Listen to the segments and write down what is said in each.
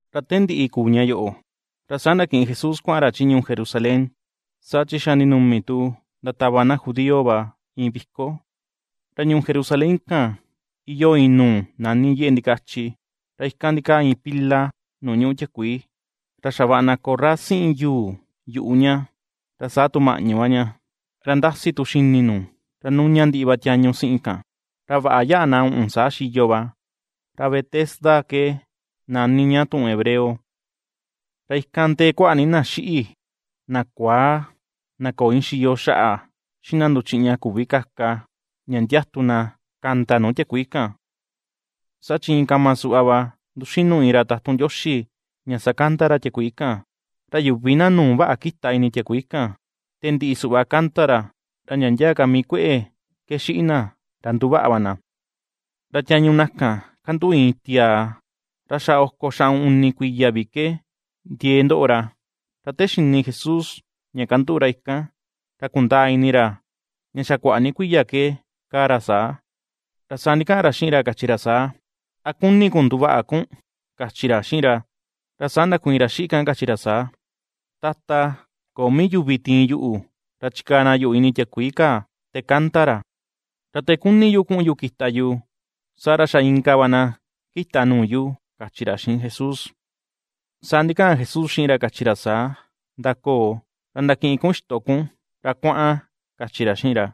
Ra te ndiꞌi kuu ña yoꞌo, ra saa ndakiꞌin Jesús kuaꞌan ra chi ñuu Jerusalén, saa chi xa ndinumi tu ndatava na judío va iin viko. Ra ñuu Jerusalén kan iyoo iin nuu nani yeꞌe ndikachi, ra ikan ndikaa iin pila nuu ñuꞌu tiakuii, ra xavaꞌa na korra siꞌin yuu yuꞌu ña ra saa tu maꞌñu va ña, ra ndasi xini nu, ra nuna ndiꞌi va tiañu siꞌin kan, ra vaꞌa yaꞌa na uꞌun saa xiyo va, ra Betesda ke nani ña tuꞌun hebreo. Ra ikan ndee kuaꞌa ni na xiꞌi, na kuaa, na köo iin xiyo xaꞌa, xiꞌin na nduchiꞌña küvi kaka, ña ndiatu na kanda nuu tiakuii kan. Saa chi iin kama suꞌva va ^nduxinu iin ra tatun Ndioxi ña sakanda ra tiakuii kan; ra yuvi na nuu vaꞌa kita ini tiakuii kan te ndiꞌi suꞌva kanda ra, ra ndia ndia ka mii kueꞌe ke xiꞌin na ra nduvaꞌa va na. Ra tiañu na kan kanduꞌu iin tiaa, ra xa oko xaꞌun uni kuiya vi ke ndiee ndoꞌo ra. Ra te xini Jesús ra ña kanduꞌu ra ikan, ra kundaa ini ra ña xa kuaꞌa ni kuiya ke kaa ra saa, ra saa ndikaꞌan ra xiꞌin ra kachi ra saa: ―¿A kuni kun nduvaꞌa kun? ―kachi ra xiꞌin ra. Ra saa ndakuiin ra xiꞌi kan kachi ra saa: ―Tata, köo mii vi yuvi tiin yuꞌu ra chikaa na yuꞌu ini tiakuii kaa te kanda ra, ra te kuni yu kuꞌun yu kita yu, saa ra xa inka va na kita nuu yu, ―kachi ra xiꞌin Jesús. Saa ndikaꞌan Jesús xiꞌin ra kachi ra saa: ―Ndakoo, ra ndakiꞌin kun ixto kun ra kuaꞌan ―kachi ra xiꞌin ra.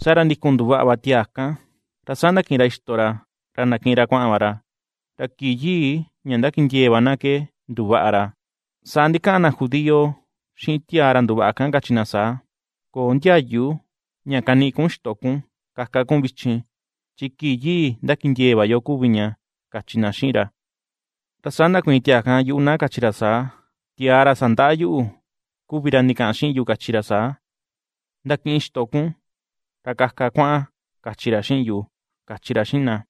Saa ra ndikun nduvaꞌa va tiaa kan ra saa ndakiꞌin ra ixto ra ra ndakiꞌin ra kuaꞌan va ra. Ra kii yii ña ndakindiee va na ke nduvaꞌa ra. Saa ndikaꞌan na judío xiꞌin tiaa ra nduvaꞌa kan kachi na saa: ―Köo ndiayu ña kaniꞌi kun ixto kun kaka kun vichin chi kii yii ndakindiee va yo kuvi ña ―kachi na xiꞌin ra. Ra saa ndakuiin tiaa kan yuꞌu na kachi ra saa: ―Tiaa ra sandaꞌa yuꞌu, kuvi ra ndikaꞌan xiꞌin yu kachi ra saa: “Ndakiꞌin ixto kun ra kaka kuaꞌan”, kachi ra xiꞌin yu ―kachi ra xiꞌin na.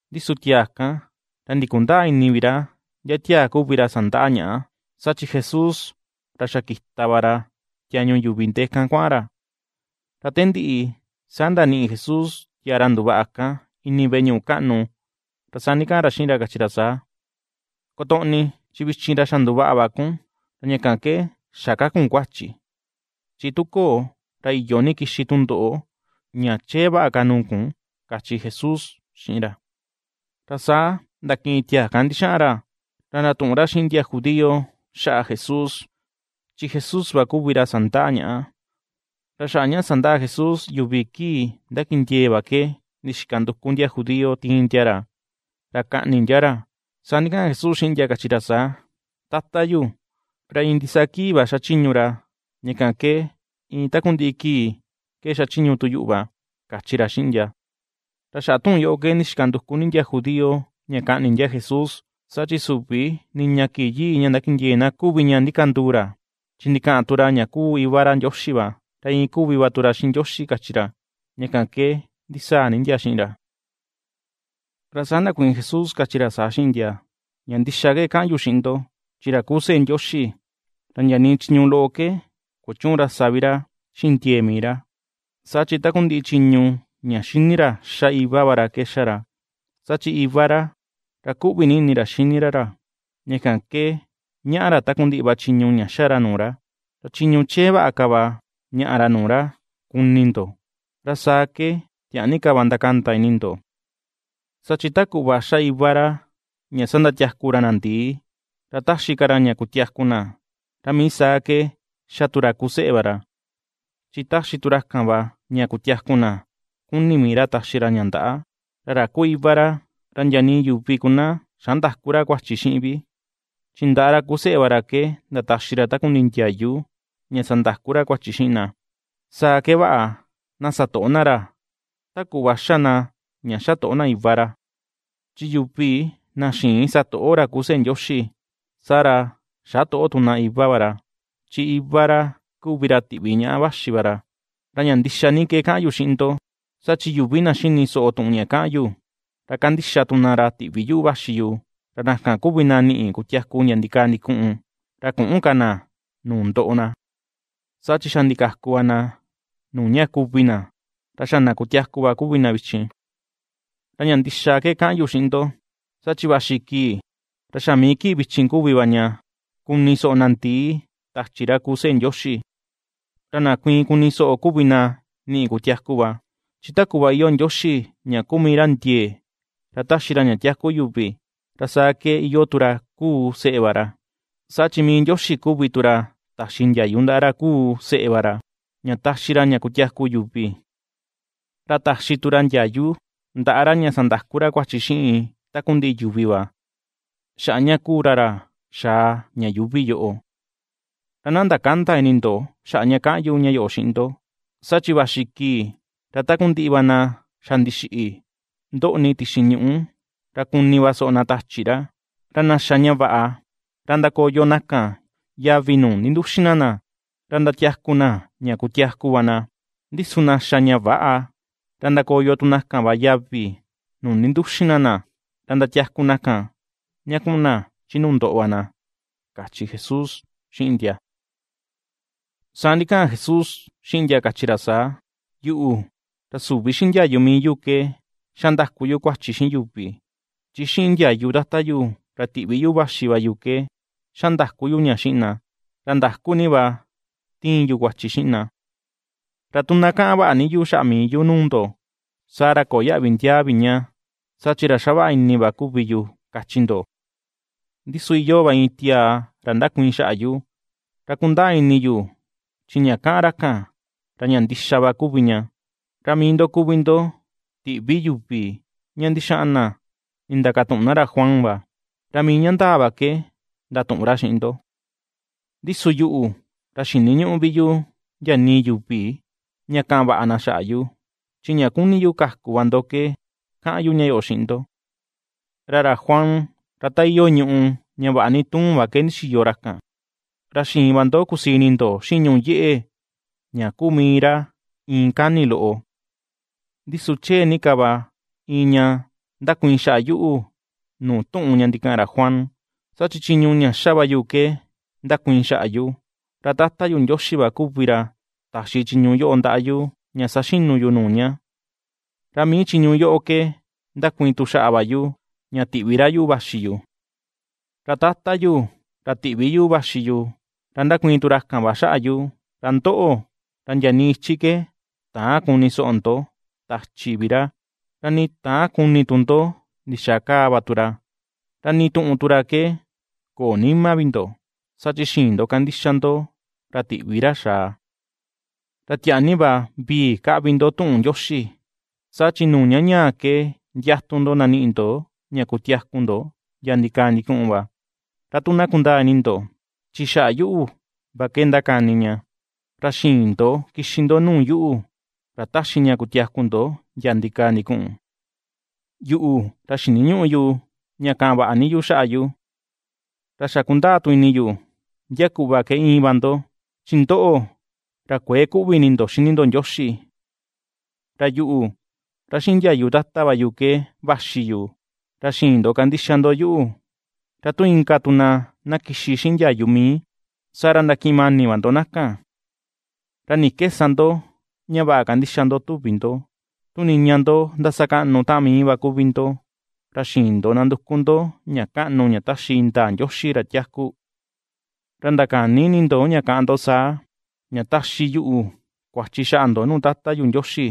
Ndi su tiaa kan ra ndikundäa ini vi ra ndia tiaa kuvi ra sandaꞌa ñaꞌa, saa chi Jesús ra xa kita va ra tiañu yuvi ndee kan kuaꞌan ra. Ra te ndiꞌi saa ndaniꞌi Jesús tiaa ra nduvaꞌa kan ini veꞌe ñuꞌu kaꞌnu, ra saa ndikaꞌan ra xiꞌin ra kachi ra saa: ―Kotoꞌni, chi vichin ra xa nduvaꞌa va kun, ra ña kan ke xä ka kun kuachi, chi tu köo ra iyo ini kixi tundoꞌo ña chee vaꞌa ka nuu kun ―kachi Jesús xiꞌin ra. Ra saa ndakiꞌin tiaa kan ndixaꞌan ra, ra ndatuꞌun ra xiꞌin ndia judío xaꞌa Jesús, chi Jesús va kuvi ra sandaꞌa ñaꞌa. Ra xaꞌa ña sandaꞌa Jesús yuvi kii ndakindiee va ke ndixika nduku ndia judío tiin ndia ra, ra kaꞌni ndia ra. Saa ndikaꞌan Jesús xiꞌin ndia kachi ra saa: ―Tata yu, ra iin ndisaa kii va xachiñu ra, ña kan ke iin takundiꞌi kii ke xachiñu tu yuꞌu va ―kachi ra xiꞌin ndia. Ra xaꞌa tuꞌun yoꞌo ke ndixika nduku ni ka na judío ña kaꞌni na Jesús, saa chi süvi niña kii yii ndakindiee na kuvi ña ndikanduu ra, chi ndikaꞌan tu ra ña kuu Iva ra Ndioxi va, ra iin kuvi va tu ra xiꞌin Ndioxi kachi ra, ña kan ke ndisaa ni ndia xiꞌin ra. Ra saa ndakuiin Jesús kachi ra saa xiꞌin ndia: ―Ña ndixa ke kaꞌan yu xiꞌin ndo, chi ra kuu seꞌe Ndioxi, ra ndia nii chiñu loꞌo ke kuchüun ra sa vii ra xiꞌin ndiee mii ra; saa chi takundiꞌi chiñu ña ^xini ra ^xa Iva va ra ke ^xa ra. Saa chi Iva ra, ra kuꞌvi ni va ini ra xini ra ra, ña kan ke ñaꞌa ra takundiꞌi va chiñu ña ^xa ra nuu ra; ra chiñu chee vaꞌa ka va ñaꞌa ra nuu ra kuni ndo, ra saa ke tiaa ni ka va ndakanda ini ndo. Saa chi ta kuꞌva ^xa Iva ra ña sandatiaku ra na ndii, ra ^taxi ka ra ña kutiaku na, ra mii saa ke ^xa tu ra kuu seꞌe va ra, chi ^taxi tu ra kan va ña kutiaku na kuni mii ra taxi ra ña ndaꞌa. Ra ra kuu Iva ra, ra ndia nii yuvi ku na xä ndaku ra kan kuachi xiꞌin vi, chi ndaꞌa ra kuu seꞌe va ra ke ndataxi ra takundiꞌi ndiayu ña sandaku ra kuachi xiꞌin na. Saa ke vaꞌa na satoꞌo na ra ta kuꞌva xa na ña xatoꞌo na Iva ra. Chi yuvi na xïin satoꞌo ra kuu seꞌe Ndioxi, saa ra, xätoꞌo tu na Iva va ra, chi Iva ra kuvi ra tiꞌvi ñaꞌa vaxi va ra. ’Ra ña ndixa ni ke kaꞌan yu xiꞌin ndo, saa chi yuvi na xini soꞌo tuꞌun ña kaꞌan yu, ra kandixa tu na ra tiꞌvi yuꞌu vaxi yu, ra na kan kuvi na niꞌi kutiaku ndia ndikaa ndikuꞌun; ra küꞌun ka na nuu ndoꞌo na, saa chi xa ndikaku va na nuu ña kuvi na, ra xa na kutiaku va kuvi na vichin. Ra ña ndixa ke kaꞌan yu xiꞌin ndo, saa chi vaxi kii, ra xa mii kii vichin kuvi va ña kuni soꞌo na ndii tachi ra kuu seꞌe Ndioxi; ra na kuiin kuni soꞌo kuvi na niꞌi kutiaku va. Chi ta kuꞌva iyoo Ndioxi ña kuu mii ra ndiee ra ^taxi ra ña tiaku yuvi, ra saa ke iyoo tu ra kuu seꞌe va ra, saa chi mii Ndioxi kuvi tu ra taxi ndiayu ndaꞌa ra kuu seꞌe va ra, ña taxi ra ña kutiaku yuvi. Ra taxi tu ra ndiayu ndaꞌa ra ña sandaku ra kuachi xiꞌin takundiꞌi yuvi va, xaꞌa ña kuu ra ra xaa ña yuuvi yoꞌo. Ra na ndakända ni ini ndo xaꞌa ña kaꞌan yu ña yoꞌo xiꞌin ndo, saa chi vaxi kii ra takundiꞌi na xa ndixiꞌi ndoꞌni tixi ñuꞌu ra kuni va soꞌo na tachi ra. Ra na xa ña vaꞌa, ra ndakoyo na kan yavi nuu ninduxin na na, ra ndatiaku na ña kutiaku va na; ndi su na xa ña väꞌa, ra ndakoyo tu na kan va yavi nuu ninduxin na na, ra ndatiaku na kan ña kuꞌun na chi nuu ndoꞌo va na ―kachi Jesús xiꞌin ndia. Saa ndikaꞌan Jesús xiꞌin ndia kachi ra saa: ―Yuꞌu, ra süvi xiꞌin ndiayu mii yu ke xa ndaku yu kuachi xiꞌin yuvi, chi xiꞌin ndiayu Tata yu ra tiꞌvi yuꞌu vaxi va yu ke xa ndaku yu ña xiꞌin na, ra ndaku ni va ^tiin yu kuachi xiꞌin na. Ra tu na kaꞌan vaꞌa ni yu xaꞌa mii yu nuu ndo, saa ra köo yaꞌvi ndiaa vi ña saa chi ra xavaꞌa ini va kuvi yu, kachi ndo. Ndi su iyoo va iin tiaa ra ndakuiin xaꞌa yu, ra kundaa ini yu chi ña kaꞌan ra kan, ra ña ndixa ni va kuvi ña. Ra mii ndo kuvi ndo tiꞌvi yuvi ña ndixaꞌan na nindakatuꞌun na ra Juan va, ra mii ña ndaa va ke ndatuꞌun ra xiꞌin ndo. Ndi su yuꞌu ra xiniñüꞌu vi yu ndia nii yuvi ña kaꞌan vaꞌa na xaꞌa yu, chi ña kuni yu kaku va ndo ke, kaꞌan yu ña yoꞌo xiꞌin ndo. Ra ra Juan ra ta iyoo iin ñùꞌù ña vaꞌa ni tuun va ke ndixiyo ra kan, ra xiin va ndo kusii ini ndo xiꞌin ñùꞌù yeꞌe ña kuu mii ra iin kani loꞌo. Ndi su chee ni ka va iin ña ndakuiin xaꞌa yuꞌu nuu tuꞌun ña ndikaꞌan ra Juan, saa chi chiñu ña xa va yu ke ndakuiin xaꞌa yu, ra Tata yu Ndioxi va kuvi ra taxi chiñu yoꞌo ndaꞌa yu ña saxinu yu nuu ña, ra mii chiñu yoꞌo ke ndakuiin tu xaꞌa va yu ña tiꞌvi ra yuꞌu vaxi yu. Ra tata yu, ra tiꞌvi yuꞌu vaxi yu, ra ndakuiin tu ra kan va xaꞌa yu; ra ndoꞌo, ra ndia nii ichi ke täan kuni soꞌo ndo tachi vi ra, ra nii täan kuni tu ndo ndixaa kaa va tu ra, ra nii tuꞌun tu ra ke köo nima vi ndo, saa chi xïin ndo kandixa ndo ra tiꞌvi ra xaa. Ra tiaa ni va vii ^kaꞌvi ndo tuꞌun Ndioxi, saa chi nuu ña ñaa ke ndiatu ndo ndaniꞌi ndo ña kutiaku ndo ndia ndikaa ndikuꞌun va, ra tu na kundaa ini ndo chi xaꞌa yuꞌu va ke ndakani ña; ra xïin ndo kixi ndo nuu yuꞌu, ra ^taxi ña kutiaku ndo ndia ndikaa ndikuꞌun. ’Yuꞌu ra xiniñüꞌu yu ña kaꞌan vaꞌa ni yuvi xaꞌa yu. Ra xa kundaa tu ini yu, ndia kuꞌva ke íin va ndo, chi ndoꞌo ra kuëe kuꞌvi ini ndo xini ndo Ndioxi. Ra yuꞌu, ra xiꞌin ndiayu Tata va yu ke vaxi yu, ra xïin ndo kandixa ndo yuꞌu, ra tu inka tu na na kixi xiꞌin ndiayu mii, saa ra ndakiꞌin mani va ndo na kan. ¿Ra ni ke sa ndo ña vaꞌa kandixa ndo tuvi ndo, tu niña ndo ndasakaꞌnu taꞌan mii va kuvi ndo, ra xïin ndo nanduku ndo ña kaꞌnu ña taxi indaa Ndioxi ra tiaku? Ra ndakäni ini ndo ña kaꞌán ndo saa, ña taxi yuꞌu kuachi xaꞌa ndo nuu Tata yu Ndioxi.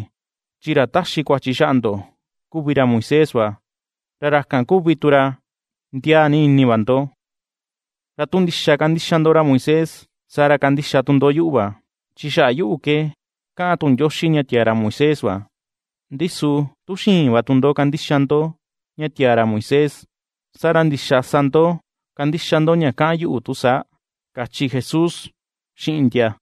Chi ra ^taxi kuachi xaꞌa ndo kuvi ra Moisés va, ra ra kan kuvi tu ra ndiaa ni ini va ndo. Ra tu ndixa kandixa ndo ra Moisés, saa ra kandixa tu ndo yuꞌu va, chi xaꞌa yuꞌu ke kaꞌan tuꞌun Ndioxi ña tiaa ra Moisés va. Ndi su tu xïin va tu ndo kandixa ndo ña tiaa ra Moisés, saa ra, ¿ndixaa sa ndo kandixa ndo ña kaꞌan yuꞌu tu saa? ―kachi Jesús xiꞌin ndia.